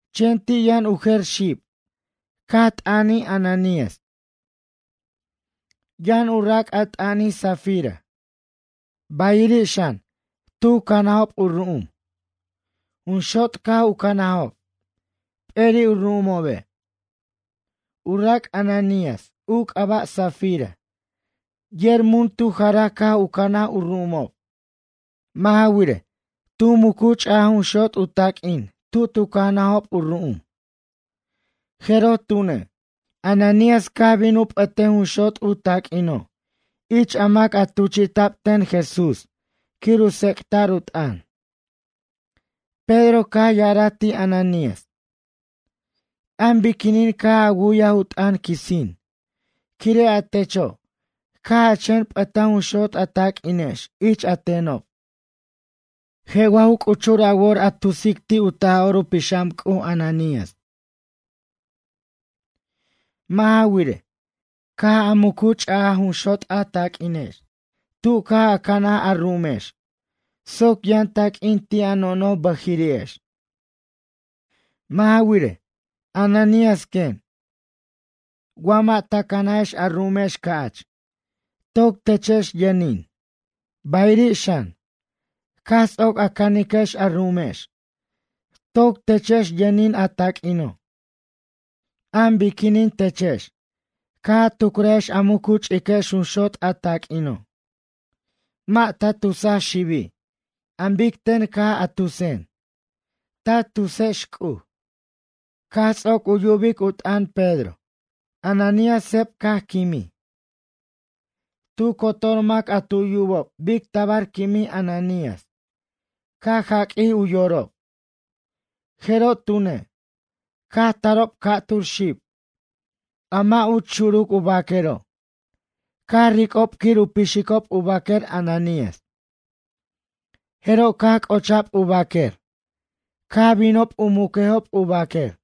Chen ti' yʌn u jer xib caj t'ʌnij Ananías. Yʌn u rac' a t'ʌnij Safira. Bayiri' xan, tu canajob u ru'um. Jun xot' caj u canajob, p'eri' u ru'umobe'. U rac' Ananías u c'aba' Safira yer mun tu jaraj caj u canaj u ru'umob. Mʌ' ja wirej, tu mucu ch'aj jun xot' u taq'uin tu tu canajob u ru'um, jeroj tune', Ananías caj bin u p'ʌtej a jun xot' u taq'uino' ich a mac a tuchi'ta'b ten Jesús quir u tsec'ta'r u t'ʌn. Pedro caj ya'araj ti' Ananías: ―An biquinin caj a wu'yaj u t'ʌn quisin quire' a techo' caj a chen p'ʌtaj jun xot' a taq'uinex ich a tenob? Je' wa ju c'uchur a wor a tusic ti' u Taj'or u Pixam C'uj Ananías. Mʌ' ja wirej, caj a mucu ch'aj jun xot' a taq'uinex tu caj a canaj a ru'umex soc yʌn taq'uin ti' a nojnoj bʌjiri'ex. Mʌ' ja wirej, Ananías quen, wa mʌ' ta cʌnajex a ru'umex ca'ch, toc techex yʌnin, bayiri' xan, caj ts'oc a caniquex a ru'umex toc techex yʌnin a taq'uino'. An biquinin techex caj a tucrajex a mucu ch'iquex jun xot' a taq'uino'? Mʌ' ta tusa xibi' an bic ten caj a tusen, ta tusex C'uj. Caj ts'oc u yubic u t'ʌn Pedro, Ananías seb caj quimij. Tu cotor mac a tu yubob bic tabar quimij Ananías caj jaq'uij u yorob. Jeroj tune', caj tarob ca'tur xib, a mʌ' uch xuruc u baquero' caj ric'ob quir u pixicob u baquer Ananías. Jeroj caj c'ocha'b u baquer caj binob u muquejob u baquer.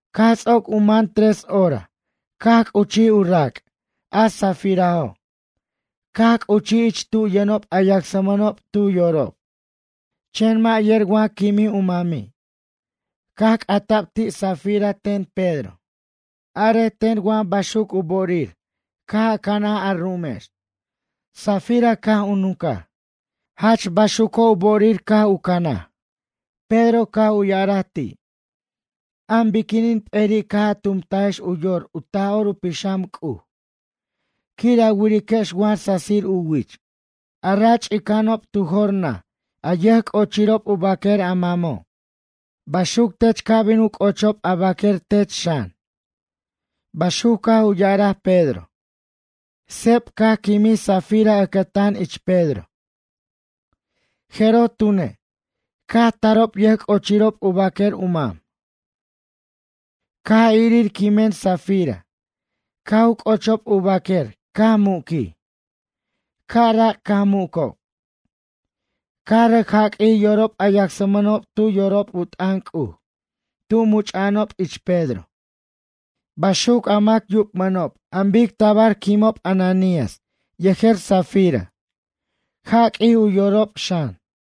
Caj ts'oc u man tres hora caj c'uchij u rac' a Safirajo', caj c'uchij ich tu yʌnob a yacsmʌnob tu yorob. Chen mʌ' yer wa quimij u mami'. Caj c'ata'b ti' Safira ten Pedro: ―Arej ten wa baxuc u bo'orir caj a canaj a ru'umex? Safira caj u nuncaj: ―Jach baxuco' u bo'orir caj u canaj. Pedro caj u ya'araj ti': ―An biquinin peri' caj a tumtajex u yor u Taj'or u Pixam C'uj quir a wiriquex wa sasir u wich? A ra ch'ica'anob tu jor naj a yʌjc'ochirob u baquer a mamo'. Baxuc tech ca' bin u c'ochob a baquer tech xan ―baxuc caj u ya'araj Pedro. Seb caj quimij Safira ʌcʌtan ich Pedro. Jeroj tune', caj tarob yʌjc'ochirob u baquer u mam. Caj irir quimen Safira caj u c'ochob u baquer caj muquij. Ca'rac caj mucob. Caj rʌc jaq'uij yorob a yacsmʌnob tu yorob u t'ʌn C'uj tu much'a'anob ich Pedro. Baxuc a mac yubmʌnob an bic tabar quimob Ananías yejer Safira, jaq'uij u yorob xan.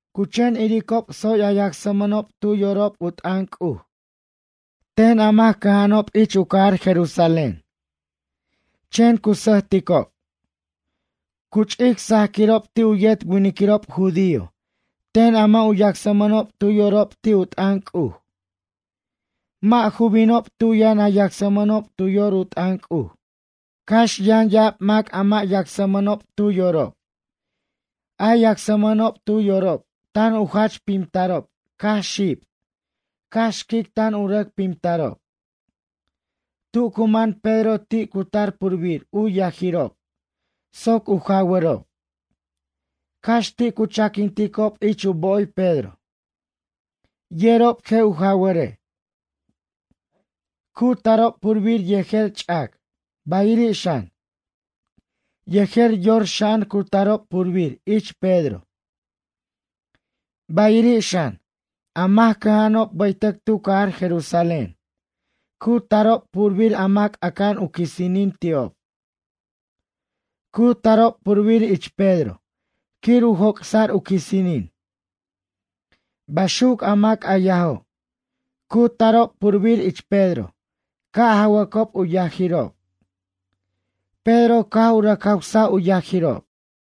Cu chen iricob tsoy a yacsmʌnob tu yorob u t'ʌn C'uj ten a mac cʌja'anob ich u cajar Jerusalén. Chen cu sʌjticob. Cu ch'ic sajquirob ti' u yet winiquirob judío ten a mʌ' u yacsmʌnob tu yorob ti' u t'ʌn C'uj. Mʌ' ju binob tu yʌn a yacsmʌnob tu yor u t'ʌn C'uj. Cax yʌn ya'ab mac a mʌ' yacsmʌnob tu yorob, a yacsmʌnob tu yorob tan u jach pimtarob cax xib, cax xquic tan u rʌc pimtarob. Tu cu man Pedro ti' cu tar purbir u yajirob soc u jawʌrob. Cax ti' cu chaquinticob ich u bo'oy Pedro, yerob je' u jaware'. Cu tarob purbir yejer ch'ac bayiri' xan, yejer yorxa'an cu tarob purbir ich Pedro. Bayiri' xan, a mac cʌja'anob bʌytʌc tu cajar Jerusalén cu tarob purbir a mac aca'an u quisinin ti'ob. Cu tarob purbir ich Pedro quir u joc'sa'r u quisinin. Baxuc a mac a yajo', cu tarob purbir ich Pedro ca' jawʌcob u yajirob. Pedro caj u rʌc jawsaj u yajirob.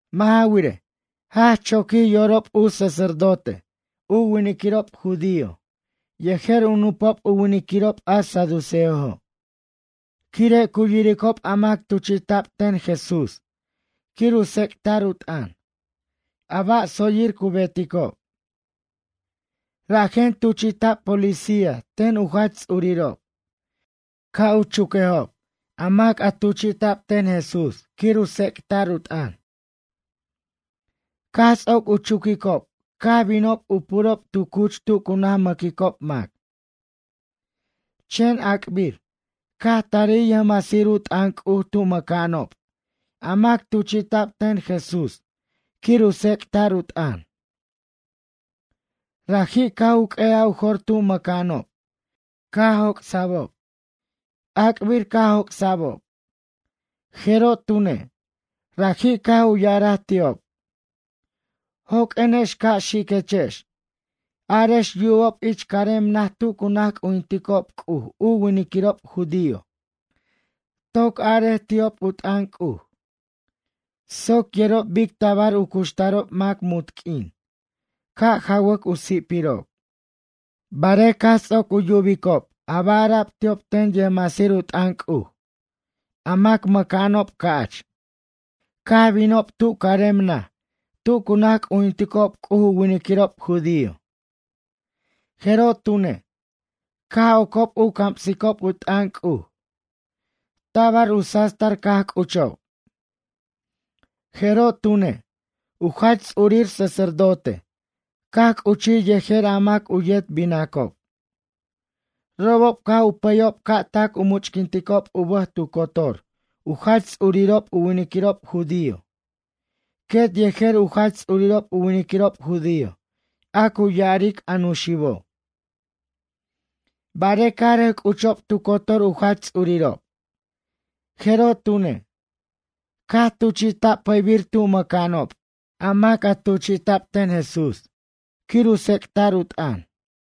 Mʌ' ja wirej, jach choquij yorob u sacerdote u winiquirob judío yejer u nupob u winiquirob a saduceojo', quire' cu yiricob a mac tuchi'ta'b ten Jesús quir u tsec'ta'r u t'ʌn, a ba' tsoyir cu beticob. Rajen tuchi'ta'b policía ten u jach ts'urirob, ca' u chuquejob a mac a tuchi'ta'b ten Jesús quir u tsec'ta'r u t'ʌn. Caj ts'oc u chuquicob caj binob u purob tu cuch tu cu naj mʌquicob mac. Chen ac'bir, caj tarij yʌjmasir u t'ʌn C'uj tu mʌca'anob a mac tuchi'ta'b ten Jesús quir u tsec'ta'r u t'ʌn. Raji' caj u q'ue'aj u jor tu mʌca'anob, caj joc'sa'ob. Ac'bir caj joc'sa'bob, jeroj tune', raji' caj u ya'araj ti'ob: ―Joq'uenex, ca' xiquechex, arex yubob ich carem naj tu cu naj c'ujinticob C'uj u winiquirob judío. Toc arej ti'ob u t'ʌn C'uj, soc yerob bic tabar u cuxtarob mac munt q'uin, ca' jawʌc u si'pirob. Barej caj ts'oc u yubicob a ba' ara'b ti'ob ten yʌjmasir u t'ʌn C'uj, a mac mʌca'anob ca'ch caj binob tu carem naj tu cu naj c'ujinticob C'uj u winiquirob judío. Jeroj tune', caj ocob u camsicob u t'ʌn C'uj. Tabar u sastar caj c'uchob. Jeroj tune', u jach ts'urir sacerdote caj c'uchij yejer a mac u yet binacob, robob caj u pʌyob ca' tac u much'quinticob u bʌj tu cotor u jach ts'urirob u winiquirob judío, quet yejer u jach ts'urirob u winiquirob judío a cu ya'aric, a nuxibo'. Barej caj rʌc c'uchob tu cotor u jach ts'urirob, jeroj tune', caj tuchi'ta'b pʌybir tu mʌca'anob a mac a tuchi'ta'b ten Jesús quir u tsec'ta'r u t'ʌn.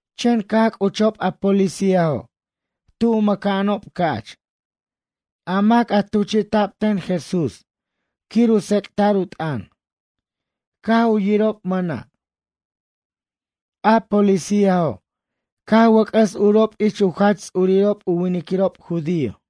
Chen caj c'uchob a policíajo' tu mʌca'anob ca'ch, a mac a tuchi'ta'b ten Jesús quir u tsec'ta'r u t'ʌn, caj u yirob mʌna'. A policíajo', caj wʌc'ʌs urob ich u jach ts'urirob u winiquirob judío.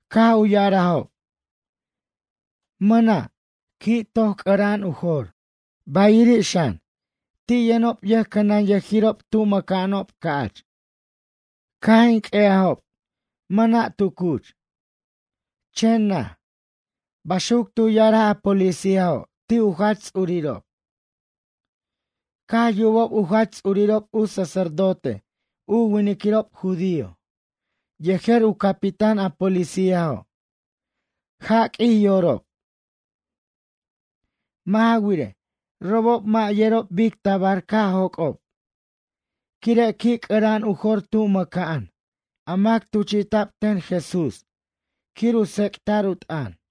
Caj u ya'arajob: ―Mʌna', qui' toy c'ʌra'an u jor, bayiri' xan, ti' yʌnob yʌjcʌnʌnyʌjirob tu mʌca'anob ca'ch. Caj in q'ue'ajob, mʌna' tu cuch, chen naj ―baxuc tu ya'araj a policíajo' ti' u jach ts'urirob. Caj yubob u jach ts'urirob u sacerdote u winiquirob judío yejer u capitán a policíajo', jaq'uij yorob. Mʌ' ja wirej, robob mʌ' yerob bic tabar caj joc'ob, quire' qui' c'ʌra'an u jor tu mʌca'an a mac tuchi'ta'b ten Jesús quir u tsec'ta'r u t'ʌn.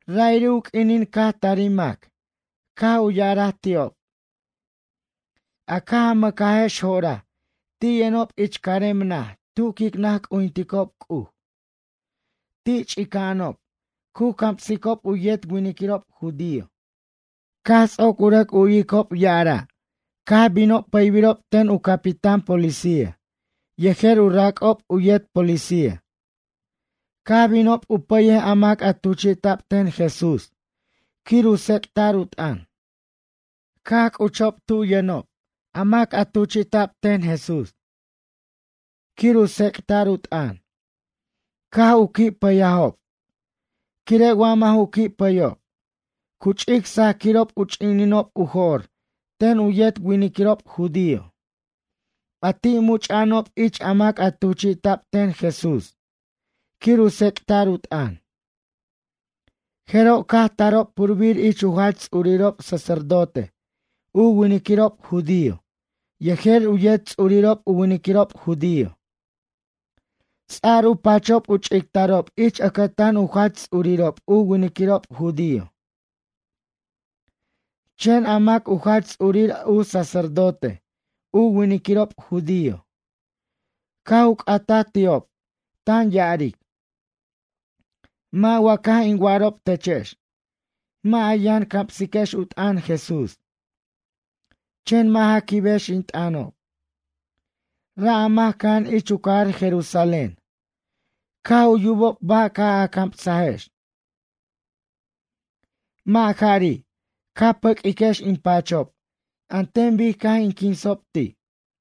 Ra'iri' u q'uinin caj tarij mac caj u ya'araj ti'ob: ―A caj a mʌcajex jo'oraj ti' yʌnob ich carem naj tu quic naj c'ujinticob C'uj. Ti' ch'ica'anob, cu camsicob u yet winiquirob judío. Caj ts'oc u rʌc u'yicob ya'araj, caj binob pʌybirob ten u capitáno' policía yejer u rac'ob u yet policía. Caj binob u pʌyej a mac a tuchi'ta'b ten Jesús quir u tsec'ta'r u t'ʌn. Caj c'uchob tu yʌnob a mac a tuchi'ta'b ten Jesús quir u tsec'ta'r u t'ʌn, caj u qui' pʌyajob, quire' wa mʌ' ju qui' pʌyob, cu ch'ic sajquirob u ch'ininob u jo'r ten u yet winiquirob judío, a ti' much'a'anob ich a mac a tuchi'ta'b ten Jesús quir u tsec'ta'r u t'ʌn. Jeroj caj tarob purbir ich u jach ts'urirob sacerdote u winiquirob judío yejer u yet ts'urirob u winiquirob judío, ts'ar u pachob u ch'ictarob ich ʌcʌtan u jach ts'urirob u winiquirob judío. Chen a mac u jach ts'urir u sacerdote u winiquirob judío, caj u c'ataj ti'ob tan ya'aric: ―Mʌ' wa caj in wa'arob techex, mʌ' a yʌn camsiquex u t'ʌn Jesús? Chen mʌ' ja quibex in t'ʌnob. Ra' a mac cʌja'an ich u cajar Jerusalén caj u yubob ba' caj a camsajex. Mʌ' jari', ca pʌq'uiquex in pachob an ten bic caj in quinsob ti'.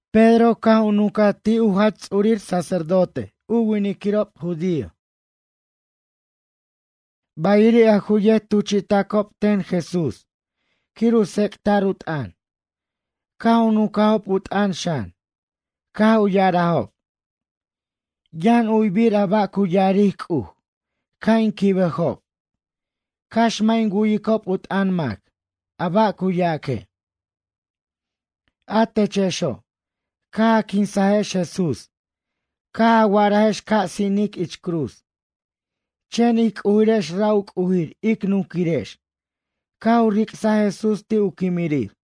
Pedro caj u nuncaj ti' u jach ts'urir u sacerdote u winiquirob judío. Bayiri' a ju yet tuchi'tacob ten Jesús quir u tsec'ta'r u t'ʌn, caj u nuncajob u t'ʌn xan, caj u ya'arajob: ―Yʌn u'yibir a ba' cu ya'aric C'uj ca' in quibejob, cax mʌ' in wu'yicob u t'ʌn mac, a ba' cu yaque'. A techexo', caj a quinsajex Jesús caj a wa'arajex ca' sinic ich cruz, chen ij C'ujirex ra' u C'ujir ic nunquirex caj u ric'saj Jesús ti' u quimirir.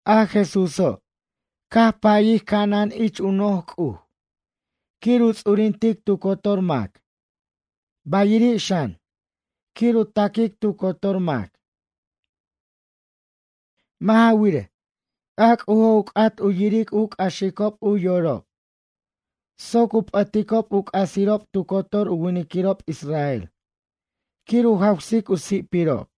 A Jesúso', caj payij ca'anan ich u noj C'uj quir u ts'urintic tu cotor mac, bayiri' xan, quir u taquic tu cotor mac. Mʌ' ja wirej, a C'ujo' u c'at u yiric u c'axicob u yorob soc u p'ʌticob u c'asirob tu cotor u winiquirob israel, quir u jawsic u si'pirob.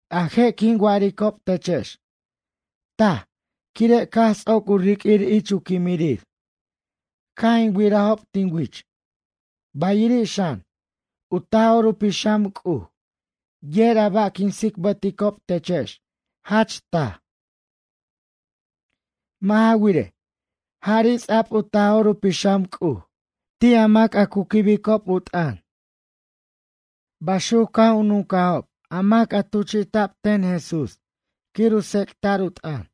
A je' quin wa'aricob techex, taj quire' caj ts'oc u riq'uir ich u quimirir caj in wirajob tin wich, bayiri' xan, u Taj'or u Pixam C'uj yer a ba' quin tsicbʌticob techex jach taj. Mʌ' ja wirej, jari' ts'a'b u Taj'or u Pixam C'uj ti' a mac a cu quibicob u t'ʌn ―baxuc caj u nuncajob a mac a tuchi'ta'b ten Jesús quir u tsec'ta'r u t'ʌn.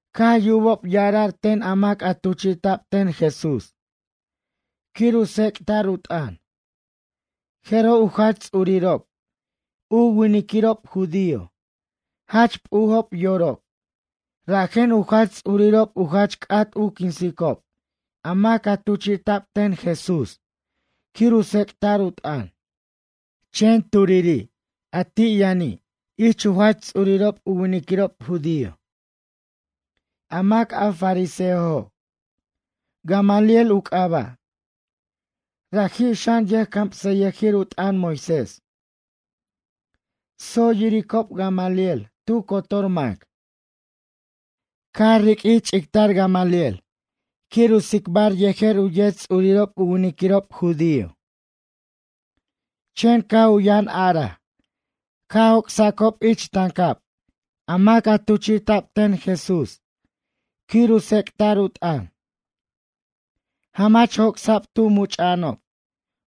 Caj yubob ya'ara'r ten a mac a tuchi'ta'b ten Jesús quir u tsec'ta'r u t'ʌn, jeroj u jach ts'urirob, u winiquirob judío jach p'ujob yorob rajen u jach ts'urirob u jach c'at u quinsicob a mac a tuchi'ta'b ten Jesús quir u tsec'ta'r u t'ʌn. Chen turiri' a ti' yʌni' ich u jach ts'urirob u winiquirob judío, a mac a fariseojo', Gamaliel u c'aba', raji' xan, yʌjcamsʌyʌjir u t'ʌn Moisés. Tsoy yiricob Gamaliel tu cotor mac. Caj riq'uij ch'ictar Gamaliel quir u tsicbar yejer u yet ts'urirob u winiquirob judío. Chen caj u yʌn araj ca' joc'sacob ich tancab a mac a tuchi'ta'b ten Jesús quir u tsec'ta'r u t'ʌn. Jamach joc'sa'b tu much'a'anob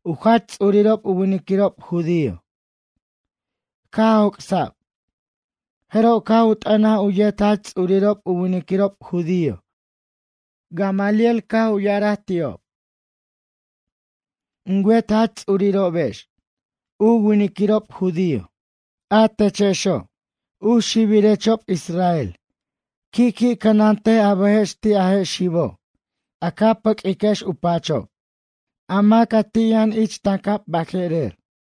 u jach ts'urirob u winiquirob judío. Caj joc'sa'b, jeroj caj u t'ʌnaj u yet jach ts'urirob u winiquirob judío Gamaliel, caj u ya'araj ti'ob: ―In wet jach ts'urirobex u winiquirob judío, a techexo', u xibirechob Israel qui' qui' cʌnantej a bʌjex ti' a je' xibo' a ca pʌq'uiquex u pachob, a mac a ti' yʌn ich tancab baje'rer.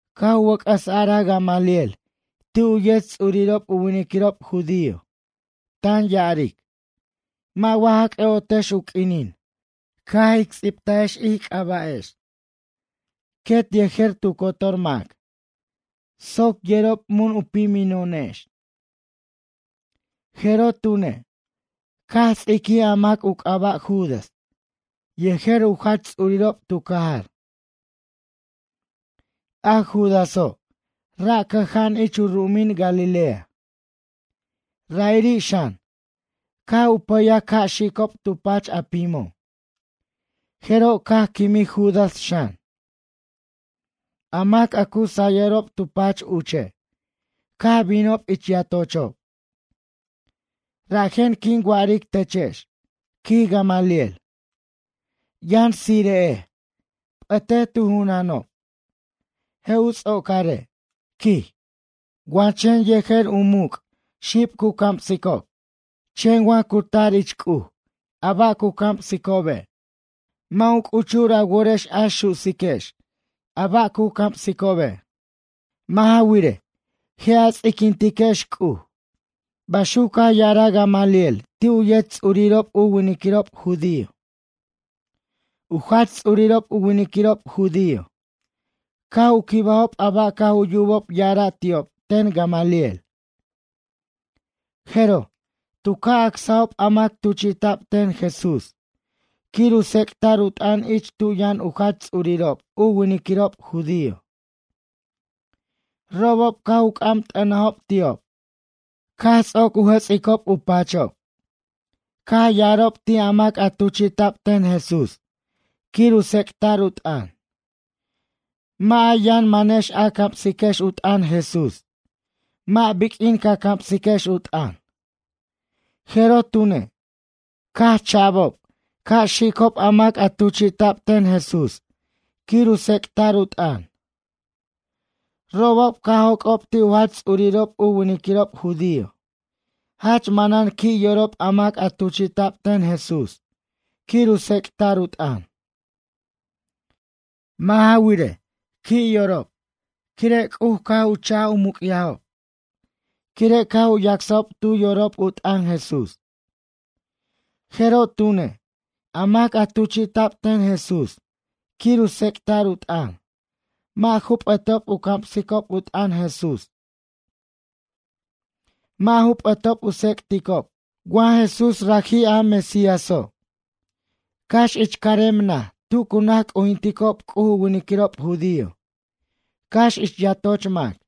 Caj u wʌc'ʌs araj Gamaliel ti' u yet ts'urirob u winiquirob judío, tan ya'aric: ―Mʌ' wa ja c'ʌ'otex u q'uinin caj ic ts'ibtajex ij c'aba'ex quet yejer tu cotor mac soc yerob mun u pimino'onex? Jeroj tune', caj ts'iquij a mac u c'aba' Judas yejer u jach ts'urirob tu cajar. A Judaso' ra' cʌja'an ich u ru'umin Galilea. Ra'iri' xan, caj u pʌyaj ca' xicob tu pach a pimo'. Jeroj caj quimij Judas xan. A mac a cu sayʌrob tu pach uche' caj binob ich yatochob. Rajen quin wa'aric techex ―quij Gamaliel―. Yʌn tsire'ej, p'ʌtej tu junanob. Je' u ts'ocare' ―quij―, wa chen yejer u muc' xib cu camsicob. Chen wa cu tar ich C'uj a ba' cu camsicobe'. Mʌ' u c'uchur a worex a su'siquex a ba' cu camsicobe'. Mʌ' ja wirej, je' a ts'iquintiquex C'uj ―baxuc caj ya'araj Gamaliel ti' u yet ts'urirob u winiquirob judío. U jach ts'urirob u winiquirob judío caj u quibajob a ba' caj u yubob ya'ara' ti'ob ten Gamaliel. Jeroj, tu ca' acsajob a mac tuchi'ta'b ten Jesús quir u tsec'ta'r u t'ʌn ich tu yʌn u jach ts'urirob u winiquirob judío. Robob caj u c'am t'ʌnajob ti'ob, caj ts'oc u jʌts'icob u pachob, caj ya'arob ti' a mac a tuchi'ta'b ten Jesús quir u tsec'ta'r u t'ʌn: ―Mʌ' a yʌn manex a camsiquex u t'ʌn Jesús, mʌ' biq'uin ca camsiquex u t'ʌn. Jeroj tune'. Caj cha'bob ca' xicob a mac a tuchi'ta'b ten Jesús quir u tsec'ta'r u t'ʌn. Robob caj joc'ob ti' u jach ts'urirob u winiquirob judío jach manan qui' yorob a mac a tuchi'ta'b ten Jesús quir u tsec'ta'r u t'ʌn. Mʌ' ja wirej, qui' yorob quire' C'uj caj u cha'j u muc'yajob quire' caj u yacsajob tu yorob u t'ʌn Jesús. Jeroj tune', a mac a tuchi'ta'b ten Jesús quir u tsec'ta'r u t'ʌn mʌ' ju p'ʌtob u camsicob u t'ʌn Jesús, mʌ' ju p'ʌtob u tsec'ticob wa Jesús raji' a Mesíaso', cax ich carem naj tu cu naj c'ujinticob C'uj u winiquirob judío, cax ich yatoch mac.